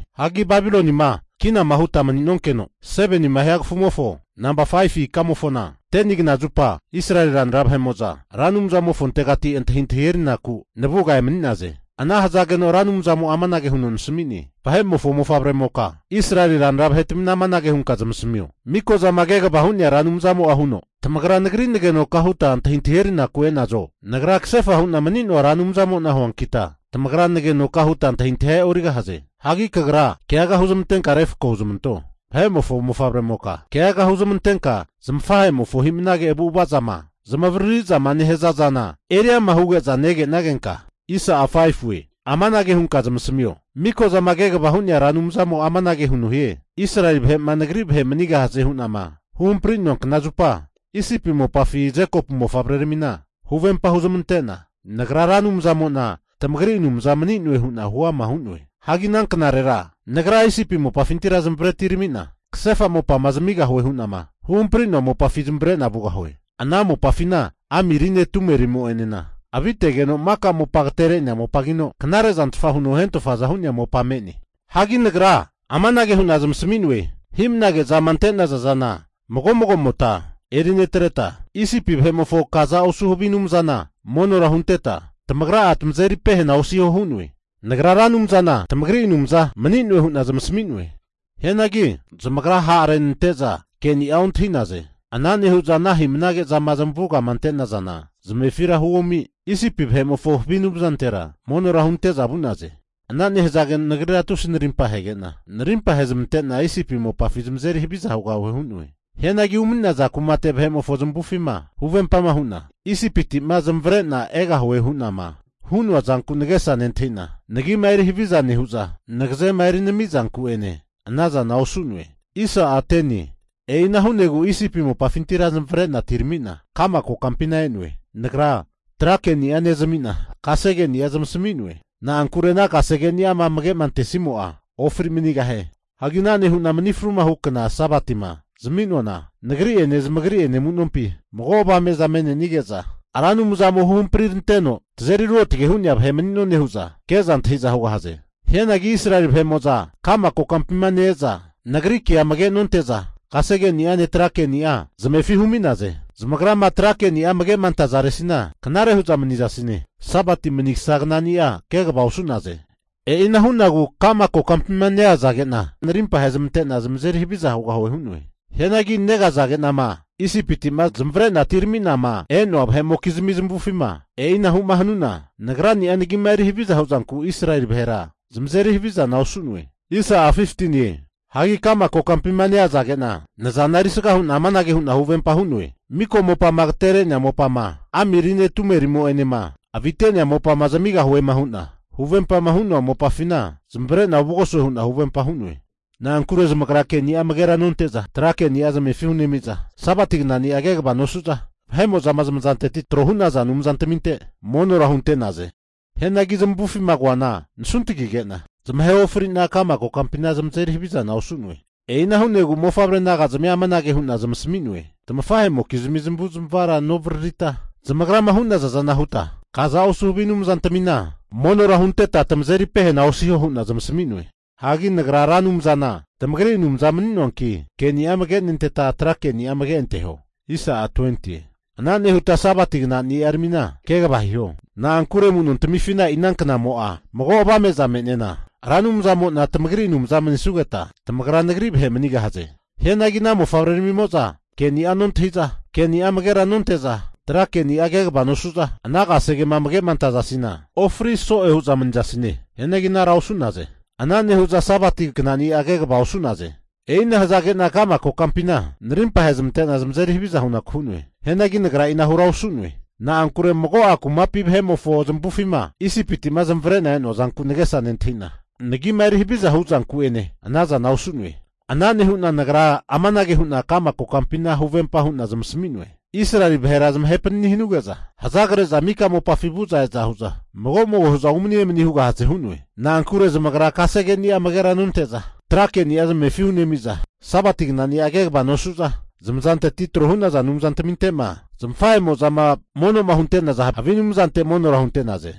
Hagi Babilonima kinama huta mani'nonkeno 7nima hia kafumofo, namba 5fu ikamofona 10ni knazupa Israeli ranra vahe'mo'za Ra Anumzamofontegati antahintahi erinaku navuga emani'naze. Ana hazageno Ra Anumzamo'a amanage huno nasmi'ne, Vahe'mofo mofavremoka, Israeli ranra vahetamina amanage hunka zamasamio, Mikozama Kegava Hu'nea Ra Anumzamo'a huno, tamagra Nagri nagenoka huta antahintahi erinaku e'nazo? Nagra kasefa hu'na mani'noa Ra Anumzamo'na huankita, tamagra nagenoka huta antahintahia e'origahaze. Hagi kagra keaga huzmantenka refko huzmanto, vahe'mofo mofavremoka, keaga huzmantenka zamafahe'mofo hi'mnage avu'ava zama zamavariri zama nehaza zana eri ama' huge'za negenagenka, amanage hunka zamasamio, Mikozama Kegava Hu'nea Anumzamo'a amanage huno hie, Israeli vahe'ma Nagri vahe manigahaze hu'nama huhampri'noa kna zupa, Isipi mopafi Jekopu mofavreramina huvempa huzmante'na Nagra Ra Anumzanamo'na tamagri Anumza mani'noe hu'na huama hu'noe. Hagi ana knarera Nagra Isipi mopafintira zamavare atirami'na kasefa mopama zamigahuema hu'na huhampri'noa mopafi zamavare'na vugahue. Ana mopafina ami rine tume rimo'enena avitegeno maka mopa agatere'nea mopagino knare'zantfa huno hentofaza hu'nea mopa me'ne. Hagi nagra amanage hu'na zamasami'noe, hi'mnage zama ante'nazana mago mago'mota eri netreta, Isipi vahe'mofo kaza osu havi anumzana monora hunteta tamagra'a tamazeri pehena osiho hu'noe. Nagra Ra Anumzana tamagri Anumza mani'noe hu'na zamasami'noe. Hianagi zamagra ha'renante'za ke'ni'a ontahi'naze. Ana nehu'za ana hi'mnage zama zamavugama ante'nazana zamefira huomi, Isipi vahe'mofo havi anumzantera monora hunte'za vu'naze. Ana nehazageno Nagrira tusi narimpa ahege'na, narimpa ahezmante'na Isipi mopafi zamazeri haviza hugahue hu'noe. Hianagi umani'naza kumate vahe'mofo zamavufima huvempama hu'na, Isipiti'ma zamavare'na egahue hu'nama hu'noa zanku nagesa nentahi'na, Nagima eri haviza nehu'za nagazema erinami zanku'ene ana zana osu'noe. E'ina hu'negu Isipi mopafintira zamavare'na atirami'na, ka'ma kokampina e'noe. Nagra tra ke'ni'a nezami'na, kasegeni'a zamasmi'noe. Na'ankure ana kasegeni'ama amage'ma antesimo'a, ofri manigahie. Hagi ana nehu'na mani fruhu kna Sabatima zami'noana, Nagri'ene zamagri'ene amu'nompi mago avame'za me'nenige'za, Ra Anumzamo huhampri ranteno tazeri ruotge hu'nea vahe mani'none hu'za ke'za antahi'za hugahaze. Hianagi Israeli vahe'mo'za ka'ma kokampima ne-eza Nagri kea amage nonte'za, kasege'ni'ane tra ke'ni'anena zamefi humi'naze. Zamagrama tra keni'a amage'ma antazaresina knare hu'za manizasine. Sabati manigasa knani'a kegava osu'naze. E'ina hu'nagu ka'ma kokampima neazage'na narimpa ahezmante'na zamazeri haviza hugahue hu'noe. Hianagi negazage'nama Isipiti'ma zamavare'na atirami'nama e'noa vahe'mokizmi zamavufima, e'inahu'ma hanu'na Nagra'a nagima eri haviza huzanku Israeli vahera zamazeri havizana osu'noe. Hagi ka'ma kokampima neazage'na nazana erisga hu'na amanage hu'na huvempa hu'noe, miko mopama ageterenea mopama amirine tumerimo'enema avite'nea mopama zamigahuema hu'na huvempama hu'noa mopafina zamavare'na ovugosue hu'na huvempa hu'noe. Na'ankure zamagra keni'a amagera nonte'za, tra keni'a zamefi hunemi'za, Sabati knani'a kegava nosu'za, vahe'mo'za zamazanteti trohu'naza anumzantaminte monora hunte'naze. Hianagi zamavufima koana nasuntagige'na zamahe ofri'na, ka'ma kokampina zamazeri havizana osu'noe. E'ina hu'negu mofavre naga'zmia amanage hu'na zamasmi'noe, tamafahe'mokizmi zamavu'zmavara novaririta, zamagrama hu'naza zana huta kaza osu havi anumzantamina monora hunteta tamazeri pehena osiho hu'na zamasami'noe. Hagi Nagra Ra Anumzana tamagri Anumza mani'noanki, keni'a amage nenteta tra keni'a amage anteho. Ana nehuta Sabati knani'aramina kegava hiho. Na'ankure amu'nontifina e'i ana knamo'a mago avame'za me'nena Ra Anumzamo'na tamagri Anumza manisugeta, tamagra Nagri vahe manigahaze. Hianagi ana mofavreramimo'za ke'ni'a nontahi'za, ke'ni'a amagera nonte'za tra keni'a kegava nosu'za, ana kasegema amage'ma antazasina, ofri so'e hu'za manizasine. Hianagi anara osu'naze. Ana nehu'za Sabati knani'a kegava osu'naze. E'ina hazage'na ka'ma kokampina narimpa ahezmante'na zamazeri haviza hunaku hu'noe. Hianagi Nagra e'inara osu'noe. Na'ankure mago'a kumapi vahe'mofo zamavufima Isipiti'ma zamavare'na e'noa zanku nagesa nentahi'na, Nagima eri haviza hu'zanku'ene ana zana osu'noe. Ana nehu'na Nagra amanage hu'na ka'ma kokampina huvempa hu'na zamasami'noe, Israeli vahera zamahe panini hanuge'za hazagre'za mika mopafi vu'za e'za hu'za mago mago hu'za umani emani hugahaze hu'noe. Na'ankure zamagra kasegeni'a amagera nonte'za, tra keni'a zamefi hunemi'za Sabati knani'a kegava nosu'za, zamazanteti tro hu'naza anumzantaminte'ma zamafahe'mo'zama mono'ma hunte'naza havi anumzante monora hunte'naze.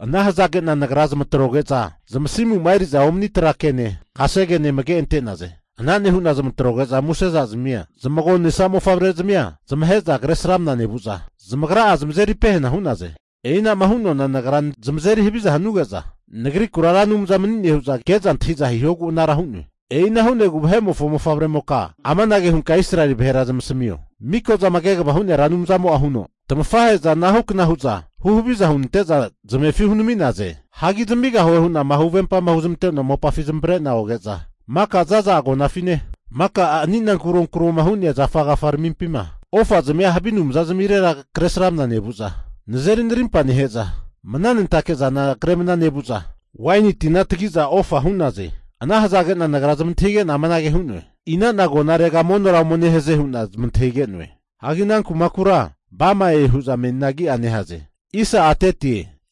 Ana hazage'na Nagra zamatroge'za zamasimuma eri'za omani tra kene, kasegene amage ante'naze. Ana nehu'na zamatroge'za musezazmia zamagonesa mofavrezmia zamahe'za Kresramana nevu'za, zamagra'a zamazeri pehena hu'naze. E'inama hu'noana Nagra zamazeri haviza hanuge'za Nagrikura Ra Anumza mani'ne hu'za ke'za antahiza hihogu anara hu'noe. E'ina hu'negu vahe'mofo mofavremoka amanage hunka Israeli vahera zamasmio, Miko'zama Kegava Hu'nea Ra Anumzamo'a huno, Tamafahe'za anahu kna hu'za huhaviza hunante'za zamefi hunami'naze. Hagi zamigahue hu'nama huvempama huzmante'noa mopafi zamavare'na oge'za, maka za'za agonafine maka anina kuronkuroma hu'nea zafa agafaramimpina ofazmia havi anumzazamirera Kresramana nevu'za nazeri narimpa nehe'za, mnanentake zana kre mna nevu'za, waini tina tagiza ofa hu'naze. Ana hazage'na Nagra zamantahige'na amanage hu'noe, Ina'na agonarega monora ome nehaze hu'na zamantahige'noe. Hagi ana kumakura Bamae hu'za menina agia nehaze.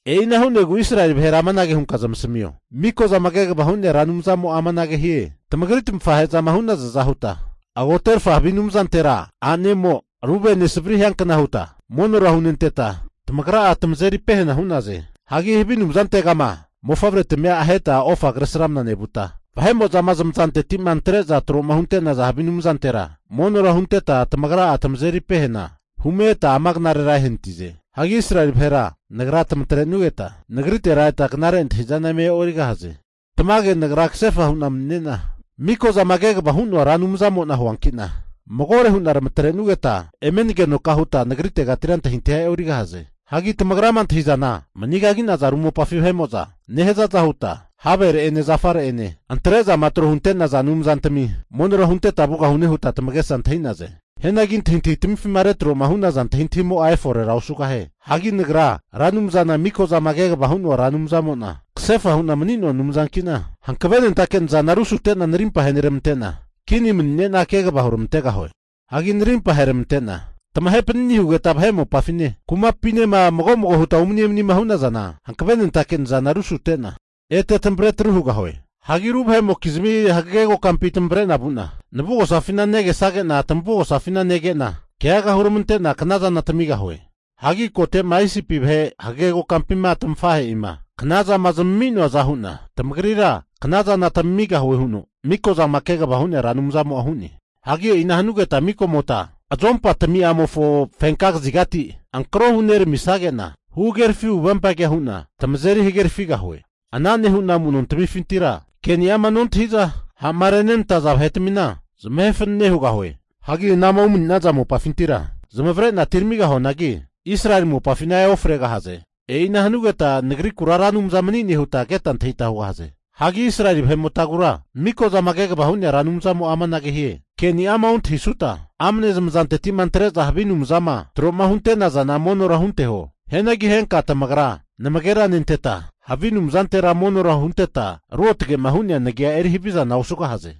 E'ina hu'negu Israeli vahera amanage hunka zamasmio, Miko'zama Kegavama Hu'nea Ra Anumzamo'a amanage hie, Tamagri tamafahe'mozama hu'nazaza huta agoterafa havi anumzantera a'nemo ru vene savri hiankna huta monora hunenteta tamagra'a tamazeri pehena hu'naze. Hagi havi anumzantega mofavretamia aheta ofa kresramna nevuta, vahe'mo'zama zamazanteti'ma antre'za tro'ma hunte'naza havi anumzantera monora hunenteta tamagra'a tamazeri pehena hume eta ama knarera ehanatize. Hagi Israeli vahera Nagra tamatre'nugeta nagritetira eta knare antahi'zana eme e'origahaze. Tamage Nagra kasefa hu'na mani'nena Miko'zama Kegavama Hu'noa Ra Anumzamo'na huanki'na, magore hu'na tamatre'nugeta eme nagenoka huta Nagritegatira antahintahia e'origahaze. Hagi tamagrama antahi'zana, manigagi'naza ru mopafi vahe'mo'za nehazaza huta havere'ene zafare'ene antre'zama tro hunte'naza anumzantami monora hunteta vugahune huta tamagesa antahi'naze. Hianagi antahitahi tamifima retroma hu'naza antahintahimo'a eforera osugahie. Hagi Nagra Ra Anumzana miko'zama kegava hu'noa Anumzamo'na kasefa Hu'na mani'noa Anumzanki'na hankavenentake nazana rusute'na narimpa aheneramante'na, kini mani'nena kegava huramantegahue. Hagi narimpa aheneramante'na tamahe panani'ma hugeta vahe mopafine kumapinema mago mago huta umani emanima hu'nazana, hankavenentake nazana rusute'na ete tamavre atru hugahue. Hagi ru vahe'mokizmi hagege kokampi tamavre'na vu'na, navugosafina negesage'na tamavugosafina nege'na keaga huramante'na knazana tamigahue. Hagi kote'ma Isipi vahe hagege kokampima tamafahe'ima knazama zami'noaza hu'na tamagrira knazana tamigahue huno Miko'zama Kegava Hu'nea Ra Anumzamo'a hu'ne. Hagi e'ina hanugeta mago mago'mota azompani'amofo fenka kazigati ankarohu neramisage'na, huhagerafi huvempagea hu'na tamazeri hagerafigahue. Ana nehu'na amu'nontmifintira keni'ama nontahi'za, ha'ma renenantaza vahetamina zamahe fanane hugahue. Hagi anama umani'naza mopafintira zamavare'na atiramigahuanagi, Israeli mopafina eofregahaze. E'ina hanugeta Nagrikura Ra Anumza mani'ne huta keta antahita hugahaze. Hagi Israeli vahe'motagura Miko'zama Kegava Hu'nea Anumzamo'a amanage hie, ke'ni'ama ontahisuta amne zamazanteti'ma antre'za havi anumzama tro hunte'nazana monora hunteho. Hianagi henka tamagra namagera nenteta, havi anumzantera monora hunteta ruotge'ma hu'nea nagia eri havizana osugahaze.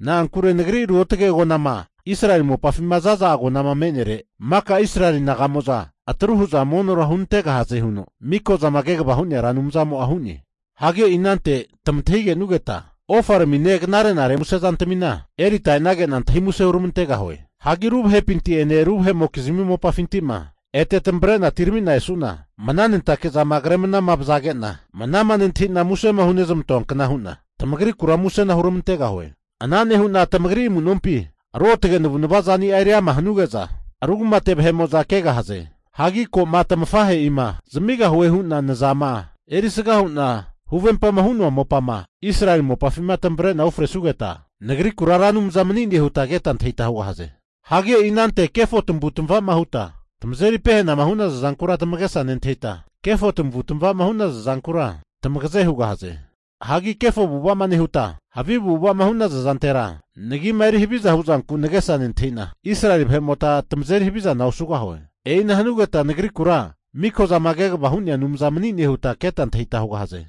Na'ankure Nagri ruotge agonama, Israeli mopafima za'za agonama me'nere maka Israeli naga'mo'za atru hu'za monora hunantegahaze huno Miko'zama Kegava Hu'nea Ra Anumzamo'a hu'ne. Hagi e'i anante tamantahi kenugeta ofaramine, knare'nare muse zantamina erita enesage'na, antahi muse huramantegahue. Hagi ru vahepinti'ene ru vahe'mokizmi mopafinti'ma ete tamavre'na atirami'na esu'na, mnanentake zama kre mana vazage'na manama nentahi'na musema hunezmantoankna hu'na tamagrikura musena huramantegahue. Ana nehu'na tamagri amu'nompi ruotge navu'nava zani'a eriama hanuge'za, ru kumate vahe'mo'za kegahaze. Hagi ko'ma tamafahe'ima zamigahue hu'na nazama erisga hu'na huvempama hu'noa mopama Israeli mopafima tamavre'na ufresugeta, Nagrikura Ra Anumza mani'ne huta keta antahita hugahaze. Hagi e'i anante kefo tamavu tamava'ma huta tamazeri pehanama hu'naza zankura tamagesa nentahita, kefo tamavu tamava'ma hu'naza zankura tamagra tamagazegu hugahaze. Hagi kefo avu'ava'ma nehuta havi avu'ava'ma hu'naza zantera, nagima eri haviza hu'zanku nagesa nentahi'na, Israeli vahe'mota tamazeri havizana osugahue. E'ina hanugeta nagrikura Mikozama Kegava Hu'nea Anumza mani'ne huta keta antahita hugahaze.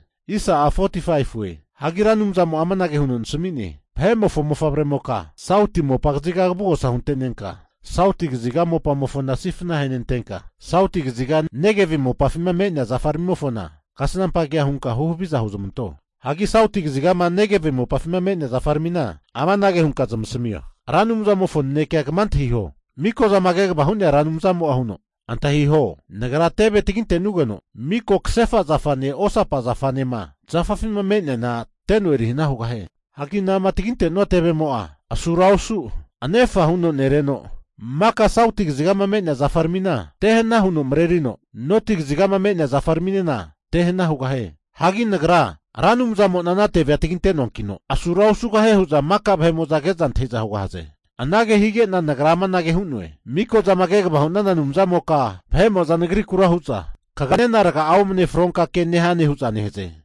Hagi Ra Anumzamo'a amanage huno nasami'ne, Vahe'mofo mofavremoka, sauti mopa kaziga kavugosa hunte'nenka sauti kaziga mopamofona sifna ahenentenka sauti kaziga Negevi mopafima me'nea zafaramimofona kasnampa kea hunka huhaviza huzmanto. Hagi sauti kazigama Negevi mopafima me'nea zafaramina amanage hunka zamasamio, Ra Anumzamofo nanekea kama antahio, Mikozama Kegava Hu'nea Anumzamo'a huno, antahiho, Nagra teve taginte'nugeno mika kasefa zafane osapa zafanema zafafima me'neana teno erihana hugahie. Hagi anama taginte'nua tevemo'a, asura osu anefa huno nereno maka sauti kazigama me'nea zafaramina tehana huno marerino, noti kazigama me'nea zafaraminena tehana hugahie. Hagi Nagra Ra Anumzamo'na ana tevea taginte'noankino, asura osugahie hu'za maka vahe'mo'za ke'za antahi'za hugahaze. Anage hige'na nagra amanage hu'noe, Mikozama Kegava hu'nana Anumzamoka, vahe'mo'za nagrikura hu'za, kagra nena raga'a omane fronka ke nehane hu'za nehaze.